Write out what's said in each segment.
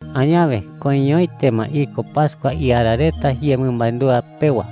Añawe koiñoete ma iko pascua iara reta yemɨmandúa pewa.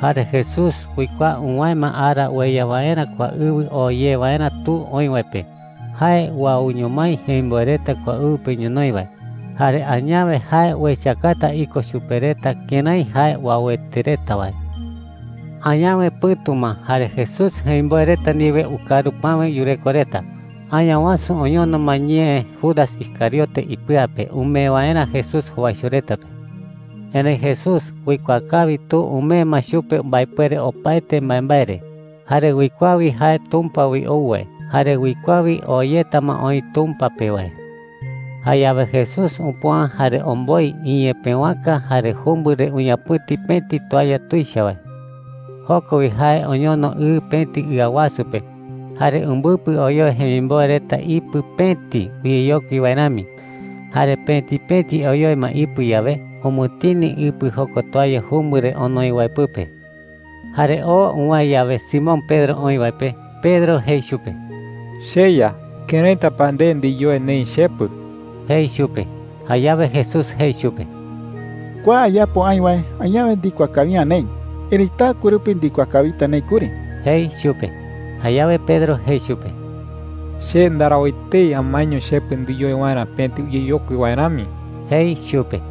Jare Jesús uikuaa uwäe ma ara ueya waerä kua ɨwɨ oo ye waerä Tu oï wae pe. Jae uauño mái jemimboe reta kua ɨwɨ pe ñonoï wae. Jare añawe jae uechakata iko chupe reta kërái jae uauete reta wae. Añawe pɨ̈tu ma jare Jesús jemimboe reta ndiwe ukaru päwe yureko reta. Añawasu oñono ma ñee Judas Iscariote ipɨa pe umee waerä Jesús jowaicho reta pe. Erëi Jesús uikuaa kawi Tu umee ma chupe mbaepuere opaete mbaembae re. Jare uikuaa wi jae Tumpa wi ou wae, jare uikuaa wi oo yeta ma oï Tumpa pe wae. Jayawe Jesús upüa, jare omboi iñepëwaka, jare jumbɨ re uñapɨ̈ti pëti toalla tuicha wae. Joko wi jae oñono ɨ pëti ɨa wasu pe, jare umbɨpɨ oyoe jemimboe reta ipɨ pëti uyeyokui wae rami. Jare pëti pëti oyoe ma ipɨ yawe, umɨtini ipɨ jokua toalla jumbɨ re onoi wae pɨpe. Jare oo uwäe yawe Simón Pedro oï wae pe, Pedro jei chupe: “CheYa, ¿këraita pa nde ndiyoe neï chepɨ?” jei chupe. Jayawe Jesús jei chupe: “Kua ayapo aï wae, añawe ndikuaa kawi’ä neï. Erëi taɨkue rupi ndikuaa kawita neï kuri,” jei chupe. Jayawe Pedro jei chupe: “Che ndarau etei amaeño chepɨ ndiyoe waerä pëti uyeyokui wae rami,” jei chupe.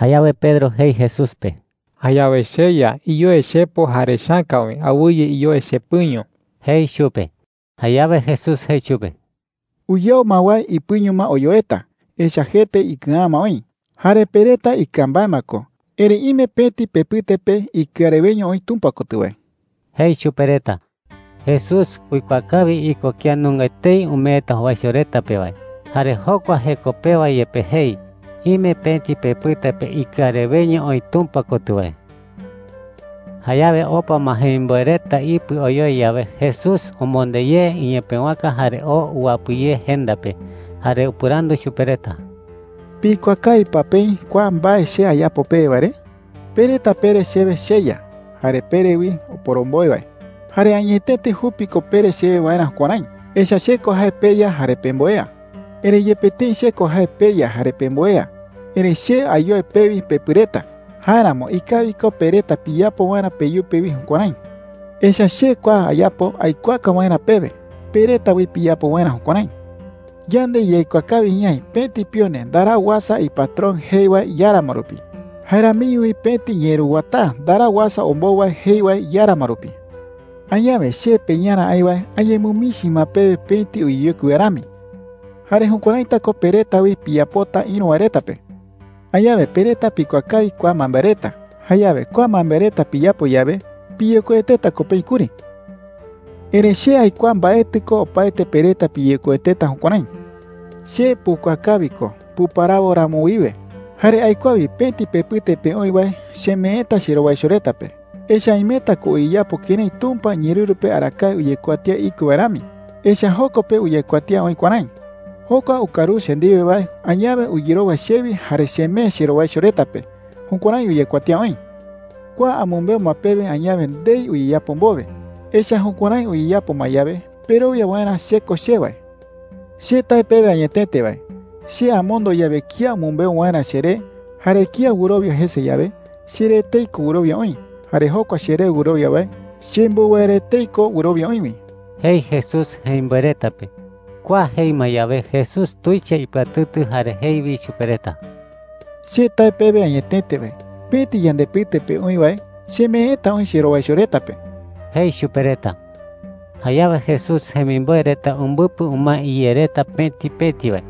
Jayawe Pedro jei Jesús pe: “Jayawe, cheYa, iyoe chepo jare chäka wi. Awɨye iyoe chepɨño,” jei chupe. Jayawe Jesús jei chupe: “Uyau ma wae ipɨño ma oyoeta, echa’ä jete ikɨa’ä ma oï. Jare pe reta ikɨa mbae ma ko. Erëi ime pëti pepɨte pe ikɨa reweño oï Tumpa kotɨ wae,” jei chupe reta. Jesús uikuaa kawi iko kía nunga etei umeeta jowaicho reta pe wae. Jare jokua jeko pewa yepe jei: “Ime pëti pepɨte pe ikɨa reweño oï Tumpa kotɨ wae.” Jayawe opa ma jemimboe reta ipɨ oyoe yawe, Jesús omonde ye iñepëwaka jare oo uwapɨ ye jenda pe. Jare upɨrandu chupe reta: “¿Pikuaa kawi pa peï kua mbae che ayapo pewe wae re? Pe reta pere chewe ‘CheYa,’ jare pere wi ‘Oporomboe wae.’ Jare añetete jupi ko pere chewe waerä jukuärái, echa’ä che ko jae peYa jare pemboea,” jei chupe reta. “Erëi yepe tëi che ko jae peYa jare pemboea, erëi che ayoe pewi pepɨ reta. Jáeramo ikawi ko pe reta piyapo waerä peyupe wi jukuärái. Echa’ä che kua ayapo aikuaaka waerä pewe, pe reta wi piyapo waerä jukuärái,” jei chupe reta. “Yande yaikuaa kawi ñaï pëti pione ndarau uasa ipatrón jei wae iáramo rupi. Jae ramiño wi pëti ñeeruwataa ndarau uasa ombou wae jei wae iáramo rupi,” jei chupe reta. “Añawe che peYarä aï wae añemɨmichi ma pewe pëti uyeyokui wae rami. Jayawe jukuäraita ko pe reta wi piyapota ïru wae reta pe,” jei chupe reta. “Añawe pe reta pikuaa kawi kua mbaembae reta. Jayawe kua mbaembae reta piyapo yawe, piyekoueteta ko peï kuri,” jei Jesús chupe reta. “Erëi che aikuaa mbaetɨ ko opaete pe reta piyekoueteta jukuärái,” jei. “Che pukuaa kawi ko puparawo ramo wiwe. Jare aikuaa wi pëti pepɨte pe oï wae chemeeta cherowaicho reta pe, echa’ä imeta ko uyeyapo kërái Tumpa iñeerɨru pe arakae uyekuatía iko wae rami. Echa’ä joko pe uyekuatía oï kuärái: ‘Jokua ukaruse che ndiwe wae añawe uyerowa chewi jare chemee cherowaicho reta pe.’ Jukuärái uyekuatía oï,” jei chupe reta. “Kua amɨmbeu ma pewe añawe ndei uyeyapo mbowe. Echa’ä jukuärái uyeyapo ma yawe, perowia waerä CHE KO CHE wae,” jei chupe reta. “Che tae pewe añetete wae, che amondo yawe kía umɨmbeu waerä cheré, jare kía wɨrowia jese yawe, cheré etei ko wɨrowia oï. Jare jokua cheré wɨrowia wae, chembou wae re etei ko wɨrowia oï wi,” jei Jesús jemimboe reta pe. Kua jei ma yawe, Jesús tuicha ipɨatɨtɨ jare jei wi chupe reta: “Che tae pewe añetete wae, pëti yandepɨte pe oï wae chemeeta oï cherowaicho reta pe,” jei chupe reta. Jayawe Jesús jemimboe reta umbɨpɨ umae iyé reta pëti pëti wae.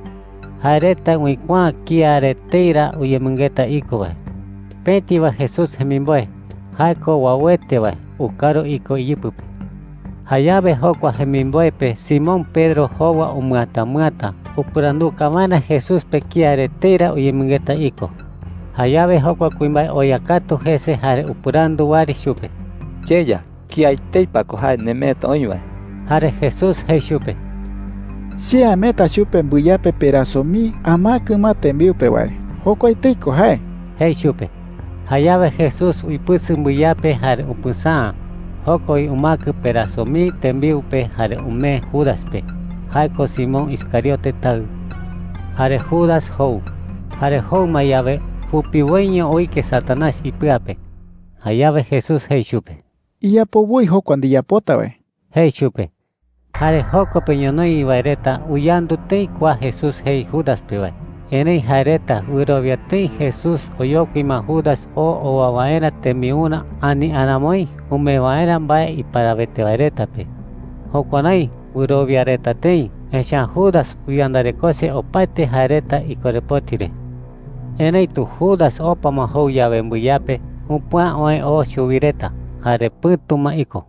Jae reta uikuaa’ä kía re etei ra uyemɨngeta iko wae. Pëti wae Jesús jemimboe – jae ko uauete wae – ukaru iko iyɨpɨ pe. Jayawe jokua jemimboe pe Simón Pedro jowa umɨatamɨata upɨranduka waerä Jesús pe kía re etei ra uyemɨngeta iko. Jayawe jokua kuimbae oya katu jese jare upɨrandu wɨari chupe: “CheYa, ¿kía etei pa ko jae nemeeta oï wae?” Jare Jesús jei chupe: “Che ameeta chupe mbɨyape peraso mii amäkɨ ma tembiu pe wae. Jokua etei ko jae,” jei chupe. Jayawe Jesús uipɨsɨ mbɨyape jare upɨsäa. Joko wi umäkɨ peraso mii tembiu pe jare umee Judas pe – jae ko Simón Iscariote taɨ. Jare Judas jou. Jare jou ma yawe, jupiwoiño uike Satanás Añawasu jee ko Satanás. ipɨa pe. Jayawe Jesús jei chupe: “Iyapo woi jokua ndiyapota wae,” jei chupe. Jare joko pe ñonoï wae reta uyandu tëi kua Jesús jei Judas pe wae. Erëi jae reta wɨrowia tëi Jesús oyokui ma Judas oo owa waerä tembiurä ani aramoi umee waerä mbae iparawete wae reta pe. Jukuärái wɨrowia reta tëi, echa’ä Judas uyandarekose opaete jae reta ikorepoti re. Erëitu Judas opa ma jou yawe mbɨyape, upüa oë oo chuwi reta. Jare pɨ̈tu ma iko.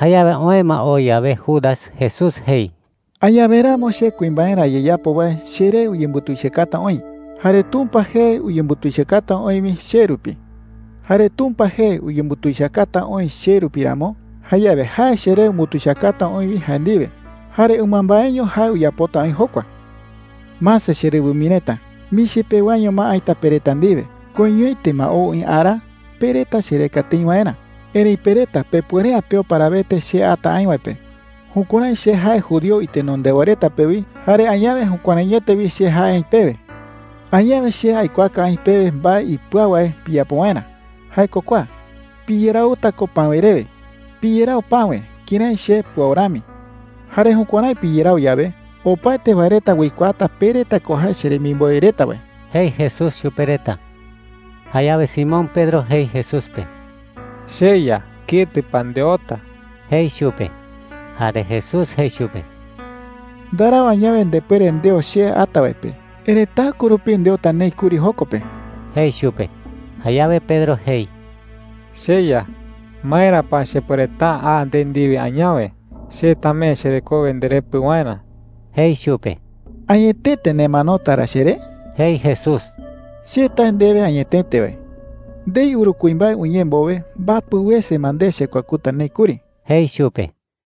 Jayawe oë ma oo yawe Judas, Jesús jei: “Añawe ramo che kuimbaerä ayeyapo wae cheree uyembutuichakata oï. Jare Tumpa jee uyembutuichakata oï wi che rupi. Jare Tumpa jee uyembutuichakata oï che rupi ramo, jayawe jae cheree umbutuichakata oï wi jae ndiwe. Jare ɨmambaeño jae uyapota oï jokua,” jei chupe reta. “Mase cherɨwɨ mii reta, michi pewaño ma aïta pe reta ndiwe. Koiñoete ma ou oï ara pe reta chereka tëi waerä. Erëi pe reta pepuere’ä peo parawete che ata aï wae pe. Jukuärái che jae judío itenondewa reta pe wi, jare añawe jukuäraiete wi che jae aï pewe,” jei chupe reta. “Añawe che aikuaaka aï pewe mbae ipɨau wae piyapo waerä. Jae ko kua: Piyerauta ko päwe rewe. Piyerau päwe kërái che puau rami. Jare jukuärái piyerau yawe, opaete wae reta uikuaata pe reta ko jae cheremimboe reta wae,” jei Jesús chupe reta. Jayawe Simón Pedro jei Jesús pe: “CheYa, ¿ketɨ pa ndeota?” jei chupe. Jare Jesús jei chupe: “Ndarau añawe ndepuere ndeo che ata wae pe. Erëi taɨkue rupi ndeota neï kuri joko pe,” jei chupe. Jayawe Pedro jei: “CheYa, ¿maera pa chepuereta’ä a nde ndiwe añawe? Che tamee cherekowe nderepɨ waerä,” jei chupe. “¿Añetete nemanota ra cheré?” jei Jesús. “Che tae ndewe añetete wae, ndei uru kuimbae uñee mbowe, mbapɨ wese ma nde chekuakuta neï kuri,” jei chupe.